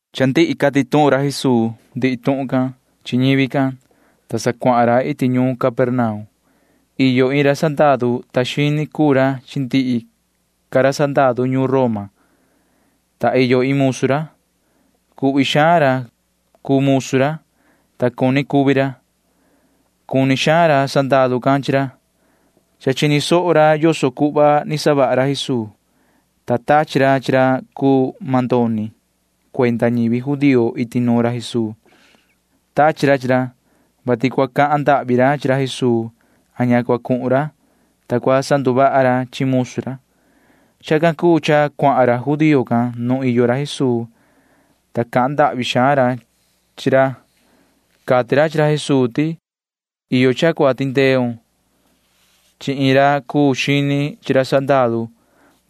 Cha ndihi cati tuhun ra Jesuu ndihi tuhun can chi ñivi can, ta sa cuahan ra iti ñuun Capernaum. Iyo iin ra sandaru cahnu cuenda ñuun Roma, ta iyo iin musu ra. Cuhvi xaan ra cuu musu ra, ta cuni cuvi ra. Cuni xaan ra sandaru can chi ra. Cha chini ra yoso cuhva ni savaha ra Jesuu, ta tachi ra chi ra cuu mandoni cuenda ñivi judío iti nuun ra Jesuu. Tachi ra chi ra, vati cua cahan ndahvi ra chi ra Jesuu a ña cua cuhun ra, ta cua sanduvaha ra chi musu ra. Chacan cuu cha cuahan ra judío can nuun iyo ra Jesuu, ta cahan ndahvi xaan ra chi ra. Cati ra chi ra Jesuu ti: ―Iyo cha cua tindeun chi iin ra sandaru cahnu,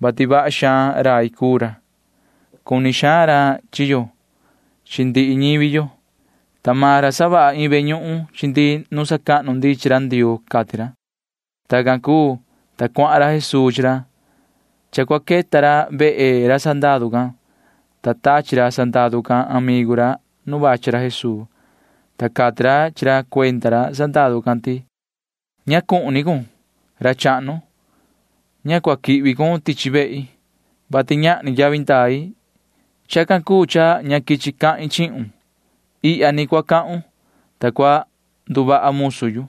vati vaha xaan rai cuu ra. Cuni xaan ra chi yo chi ndihi ñivi yo, ta maan ra savaha iin ve ñuhun chi ndi nu sacahnu ndi chi ra Ndioo ―cati ra. Tacan cuu, ta cuahan ra Jesuu chi ra. Cha cua queta ra vehe ra sandaru can, ta tachi ra sandaru can amigu ra nu vachi ra Jesuu, ta cati ra chi ra cuenda ra sandaru can ti: ―Ña cuhun ni cun, ra chahnu. Ña cua quihvi cun tichi vehi, vati ñahni yavi ndai. Chacan cuu cha ña quichi yu cahin chihun. Ihya ni cua cahun, ta cua nduvaha musu yu.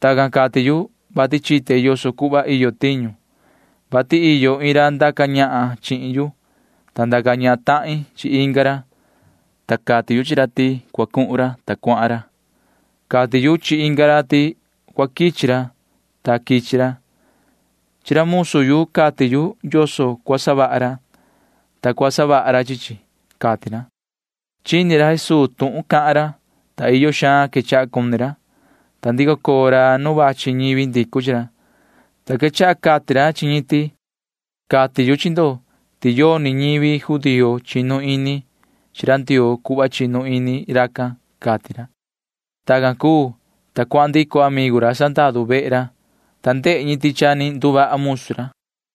Tacan cati yu, vati chite yoso cuhva iyo tiñu, vati iyo iin ra ndaca ñahan chihin yu, ta ndaca ñahan tahin chi inga ra, ta cati yu chi ra ti cua cuhun ra, ta cuahan ra. Cati yu chi inga ra ti cua quichi ra, ta quichi ra. Chi ra musu yu cati yu yoso cua savaha ra, ta cua savaha ra chi chi ―cati ra. Chini ra Jesuu tuhun cahan ra, ta iyo xaan quechaha cuni ra, ta ndico coo ra nu vachi ñivi ndicu chi ra, ta quechaha cati ra chi ñi ti: ―Cati yu chi ndo ti yoni ñivi judío chinu ini chi ra Ndioo cuhva chinu ini racan ―cati ra. Tacan cuu, ta cuahan ndico amigu ra sandaru vehe ra, ta ndehe ñi ti cha ni nduvaha musu ra.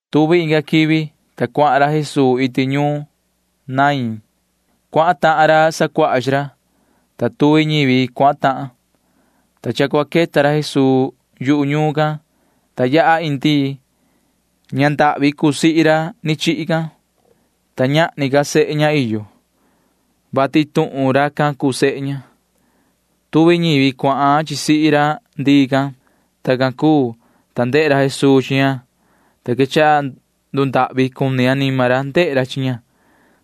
Tuvi inga quivi, ta cuahan ra Jesuu iti ñuun Naín. Cuahan tahan ra sacuaha chi ra, ta tuvi ñivi cuahan tahan, ta cha cua queta ra Jesuu yu ñuun can, ta yaha iin ndii. Ña ndahvi cuu sihi ra ni chihi can, ta ñahni ca sehe ña iyo, vati iin tuhun racan cuu sehe ña. Tuvi ñivi cuahan chi sihi ra ndii can. Tacan cuu, ta ndehe ra Jesuu chi ña, ta quechaha ndundahvi cuni anima ra ndehe ra chi ña,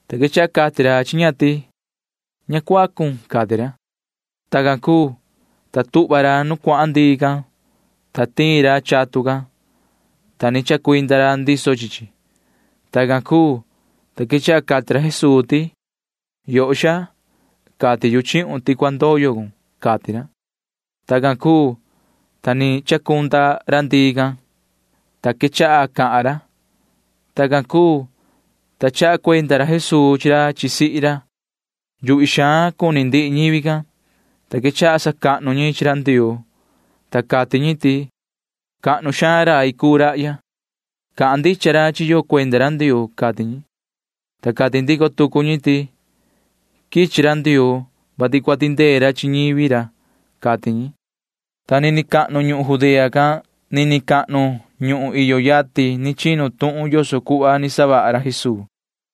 ta quechaha cati ra chi ña ti: ―Ña cuacun ―cati ra. Tacan cuu, ta tuhva ra nu cuahan ndii can, ta tiin ra chatun can, ta ni chacuinda ra ndiso chi chi. Tacan cuu, ta quechaha cati ra Jesuu ti: ―Yoho xaa, cati yu chihun ti cua ndoyo cun ―cati ra. Tacan cuu, ta ni chacunda ra ndii can, ta quechaha cahan ra. Tacan cuu, ta chaha cuenda ra Jesuu chi ra chi sihi ra. Yuhvi xaan cuni ndihi ñivi can, ta quechaha sacahnu ñi chi ra Ndioo, ta cati ñi ti: ―¡Cahnu xaan rai cuu rahya! Cahan ndicha ra chi yo cuenda ra Ndioo ―cati ñi. Ta cati ndico tucu ñi ti: ―Quichi ra Ndioo, vati cua tindee ra chi ñivi ra ―cati ñi. Ta nini cahnu ñuhun Judea can nini cahnu ñuhun iyo yatin chinu tuhun yoso cuhva ni savaha ra Jesuu.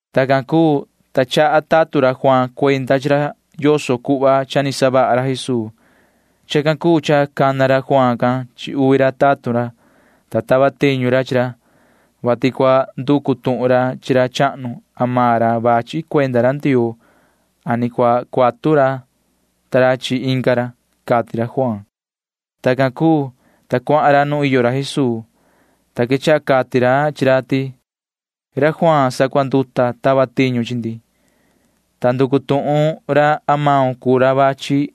Tacan cuu, ta chaha ra tatun ra Juaan cuenda chi ra yoso cuhva cha ni savaha ra Jesuu. Chacan cuu cha cana ra Juaan can chi uvi ra tatun ra, ta tava tiñu ra chi ra, vati cua nducu tuhun ra chi ra chahnu atu suvi ni maan ra cuu ra cua quichi cuenda ra Ndioo a ni cua cuatu ra ta ra chi inga ra, cati ra Juaan. Tacan cuu, ta cuahan ra nu iyo ra Jesuu, ta quechaha cati ra chi ra ti: ―Juaan ra sacuanduta tava tiñu chi ndi, ta nducu tuhun ra atu maun cuu ra cua quichi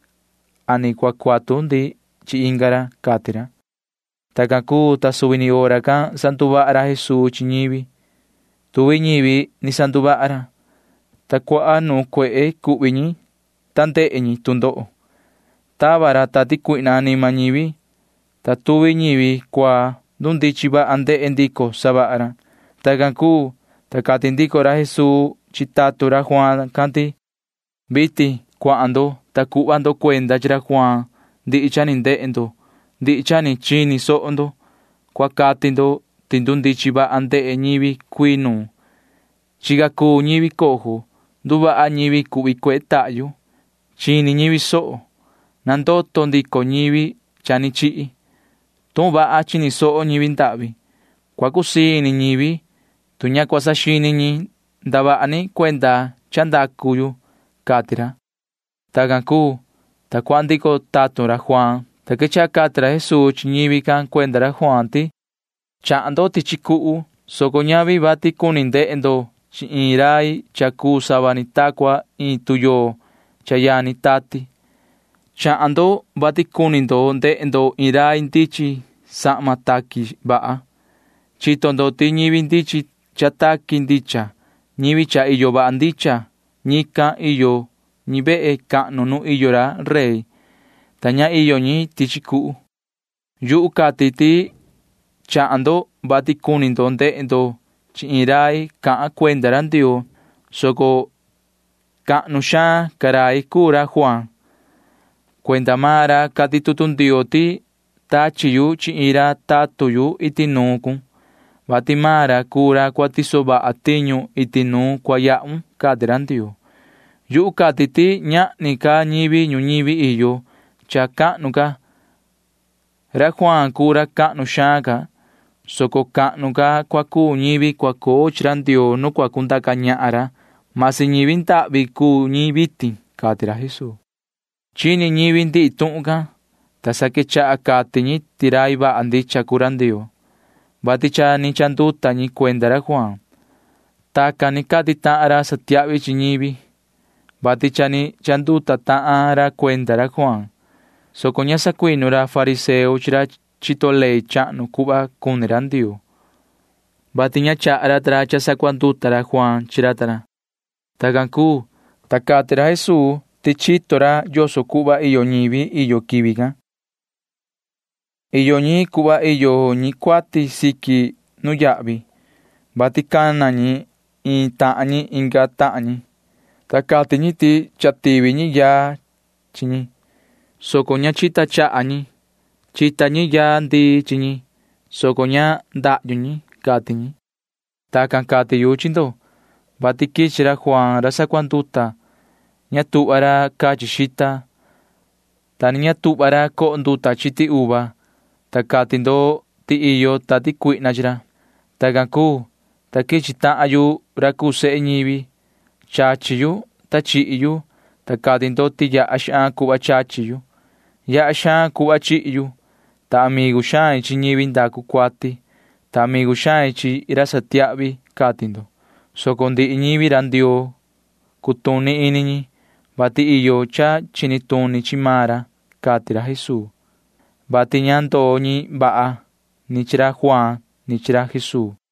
a ni cua cuatu ndi chi inga ra ―cati ra. Tacan cuu, ta suvi ni hora can sanduvaha ra Jesuu chi ñivi. Tuvi ñivi ni sanduvaha ra, ta cuaha nuun cuehe cuhvi ñi ndehe ñi tu ndoho. Tava ra tati cuihna anima ñivi, ta tuvi ñivi cuaa―ndundichin vaha ndehe ndico ñi savaha ra. Tacan cuu, ta cati ndico ra Jesuu chi tatun ra Juaan can ti: ―Vitin cuahan ndo, ta cuhva ndo cuenda chi ra Juaan ndihi cha ni ndehe ndo ndihi cha ni chini soho ndo. Cua cati ndo ti ndundichin vaha ndehe ñivi cuii nuun. Chica cuu ñivi cojo. Nduvaha ñivi cuhvi cuehe tahyu. Chini ñivi soho. Nandoto ndico ñivi cha ni chihi. Tuhun vaha chini soho ñivi ndahvi. Cua cusii ini ñivi, tu ña cua saxini ñi ndavaha ni cuenda cha ndacu yu ―cati ra. Tacan cuu, ta cuahan ndico tatun ra Juaan, ta quechaha cati ra Jesuu chi ñivi can cuenda ra Juaan ti: ―Chahan ndo tichi cuhu, soco ñavi vati cuni ndehe ndo chi iin rai cha cuu sava ni ta cua iin tuyoo cha yani tati. Chahan ndo, soco ñavi vati cuni ndehe ndo iin rai ndichin sahma taqui vaha. Chito ndo ti ñivi ndichin cha taqui ndicha, ñivi cha iyo vaha ndicha―ñican iyo ñi vehe cahnu nu iyo ra rey, ta ña iyo ñi tichi cuhu. Yuhu cati ti chahan ndo, vati cuni ndo ndehe ndo chi iin rai cahan cuenda ra Ndioo, soco cahnu xaan ca rai cuu ra Juaan. Cuenda maan ra cati tutu Ndioo ti: Tachi yu chi iin ra tatun yu iti nuun cun, vati maan ra cuu ra cua tiso vaha tiñu iti nu cua yahun, cati ra Ndioo. Yuhu cati ti ñahni ca ñivi ñuñivi iyo cha cahnu ca. Ra Juaan cuu ra cahnu xaan ca, soco cahnu ca cua cuu ñivi cua coo chi ra Ndioo nu cua cundaca ñahan ra―masi ñivi ndahvi cuu ñi vitin ―cati ra Jesuu. Chini ñivi ndihi tuhun can, ta sa quechaha cati ñi ti rai vaha ndicha cuu ra Ndioo, vati cha ni chanduta ñi cuenda ra Juaan. Tacan ni cati tahan ra satiahvi chi ñivi, vati cha ni chanduta tahan ra cuenda ra Juaan, soco ña sacuinu ra fariseo chi ra chito ley chahnu cuhva cuni ra Ndioo chi ra ta ra, vati ña chaha ra ta ra cha sacuanduta ra Juaan chi ra ta ra. Tacan cuu, ta cati ra Jesuu ti chito ra yoso cuhva iyo ñivi iyo quivi can. Iyo ñi cuhva iyo ñi cuati siqui nuyahvi, vati cana ñi iin tahan ñi inga tahan ñi, ta cati ñi ti cha tivi ñi yaa chi ñi, soco ña chita chaha ñi. Chita ñi yaa ndii chi ñi, soco ña chacu ñi, cati ñi. Tacan cati yu chi ndo, vati quichi ra Juaan ra sacuanduta. Ña tuhva ra cachi ra xita, ta ni ña tuhva ra coho ra nduta chiti uva, ta cati ndo ti iyo tati cuihna chi ra. Tacan cuu, ta quichi tahan yu ra cuu sehe ñivi. Chachi yu, ta chihi yu, ta cati ndo ti yaha xaan cuhva chachi yu. Yaha xaan cuhva chihi yu, ta amigu xain chi ñivi ndacu cuati, ta amigu xain chi ra satiahvi, cati ndo, soco ndihi ñivi ra Ndioo cutuni ini ñi, vati iyo cha chini tuni chi maan ra, cati ra Jesuu, [vati ña ndoo ñi vaha ni chi ra Juaan ni chi ra Jesuu.]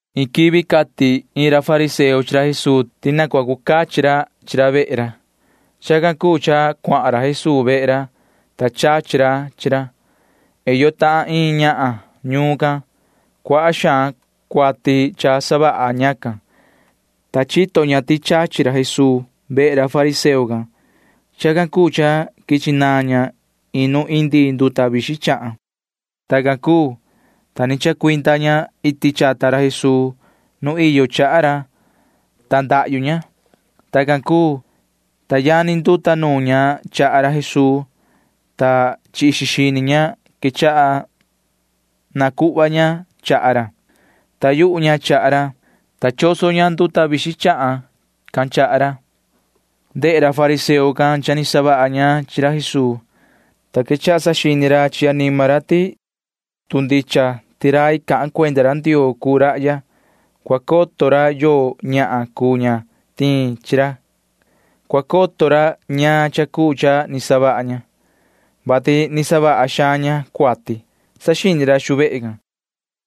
Iin quivi cati iin ra fariseo chi ra Jesuu ti na cua cu cachi ra chi ra vehe ra. Chacan cuu cha cuahan ra Jesuu vehe ra, ta chachi ra chi ra. Iyo tahan iin ñahan ñuun can. Cuaha xaan cuati cha savaha ñacan, ta chito ña ti chachi ra Jesuu vehe ra fariseo can. Chacan cuu cha quichi naan ña iin nu indi nduta vixin chahan. Tacan cuu, ta ni chacuinda ña iti chata ra Jesuu nu caa ra, ta ndahyu ña. Tacan cuu, ta yani nduta nuun ña chaha ra Jesuu, ta chi ixi xini ña quechaha nacuhva ña chaha ra. Taa yuhu ña chaha ra, ta choso ña nduta vixin chahan can chaha ra. Ndehe ra fariseo can cha ni savaha ña chi ra Jesuu, ta quechaha saxini ra chi anima ra ti tu ndicha ti rai cahan cuenda ra Ndioo cuu rahya, cua coto ra yoo ñahan cuu ña tiin chi ra. Cua coto ra ñaan cha cuu cha ni savaha ña, vati ni savaha xaan ña cuati, saxini ra xu vehe can.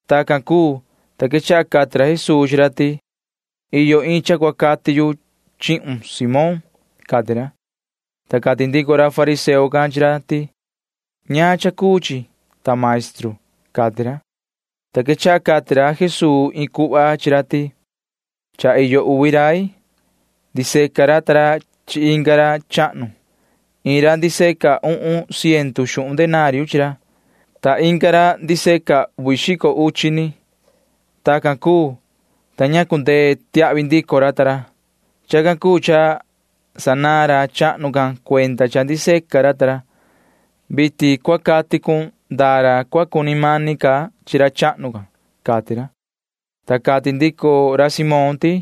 Tacan cuu, ta quechaha cati ra Jesuu chi ra ti: ―Iyo iin cha cua cati yu chihun, Simón ―cati ra. Ta cati ndico ra fariseo can chi ra ti: ―¿Ñaan cha cuu chi, ta maestru? ―cati ra. Ta quechaha cati ra Jesuu iin cuhva chi ra ti: ―Cha iyo uvi rai. Ndiseca ra ta ra chi inga ra chahnu. Iin ra ndiseca uhun ciendu xuhun denario chi ra, ta inga ra ndiseca uvi xico uchi ni. Tacan cuu, ta ña cundee tiahvi ndico ra ta ra. Chacan cuu cha sanaan ra chahnu can cuenda cha ndiseca ra ta ra. Vitin cua cati cun ndaa ra cua cuni mani ca chi ra chahnu can ―cati ra. Ta cati ndico ra Simón ti: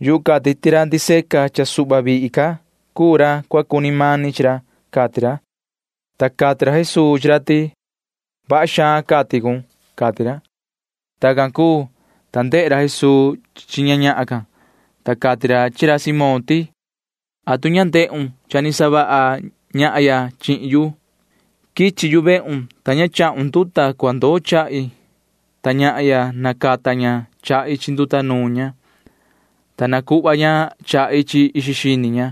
―Yuhu cati ti ra ndiseca cha suhva vihi ca cuu ra cua cuni mani ca chi ra ―cati ra. Ta cati ra Jesuu chi ra ti: ―Vaha xaan cati cun ―cati ra. Tacan cuu, ta ndehe ra Jesuu chi ña ñahan can, ta cati ra chi ra Simón ti: ―¿Atu ña ni ndehun cha ni savaha ñahya chihin yu? Quichi yu vehun, ta ña chahun nduta cua ndoo chahi, ta ñahya―nacata ña chahi chi nduta nuun ña, ta nacuhva ña chahi chi ixi xini ña.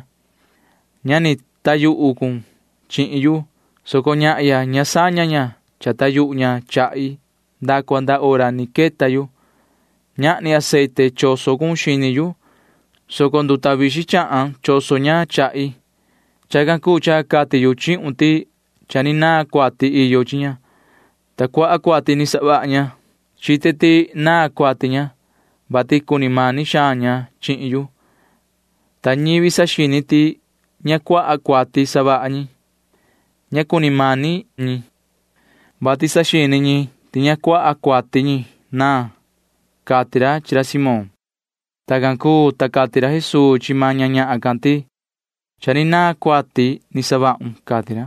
Ña ni taa yuhu cun chihin yu, soco ña chacuita cha taa yuhu maan ña chahi nda cua nda hora ni quichi yu. Ñahni aceite choso cun xini yu, soco nduta vixin chahan choso ña chahi. Chacan cuu cha cati yu chihun ti cha ni naan cuati iyo chi ña, ta cuaha suhva cuati ni savaha ña. Chite ti ni naan cuati ña, vati cuni mani xaan ña chihin yu. Ta ñivi saxini ti ña savaha xaan ñi cuati―ña cuni mani xaan ñi, vati saxini ñi ti ña cuaha cuati ñi naan ―cati ra chi ra Simón. Tacan cuu, ta cati ra Jesuu chi maan ña ñahan can ti: ―Cha ni naan cuati ni savahun ―cati ra.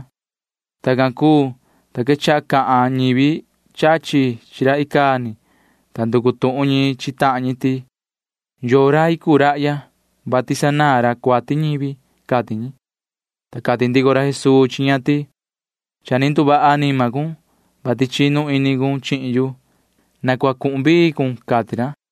Tacan cuu, ta quechaha cahan ñivi chachi chi ra icaa ni, ta nducu tuhun ñi chi tahan ñi ti: ―¿Yoo rai cuu rahya, vati sanaan ra cuati ñivi? ―cati ñi. Ta cati ndico ra Jesuu chi ña ti: ―Cha ni nduvaha anima cun, vati chinu ini cun chihin yu. Na cua cuhun vii cun ―cati ra.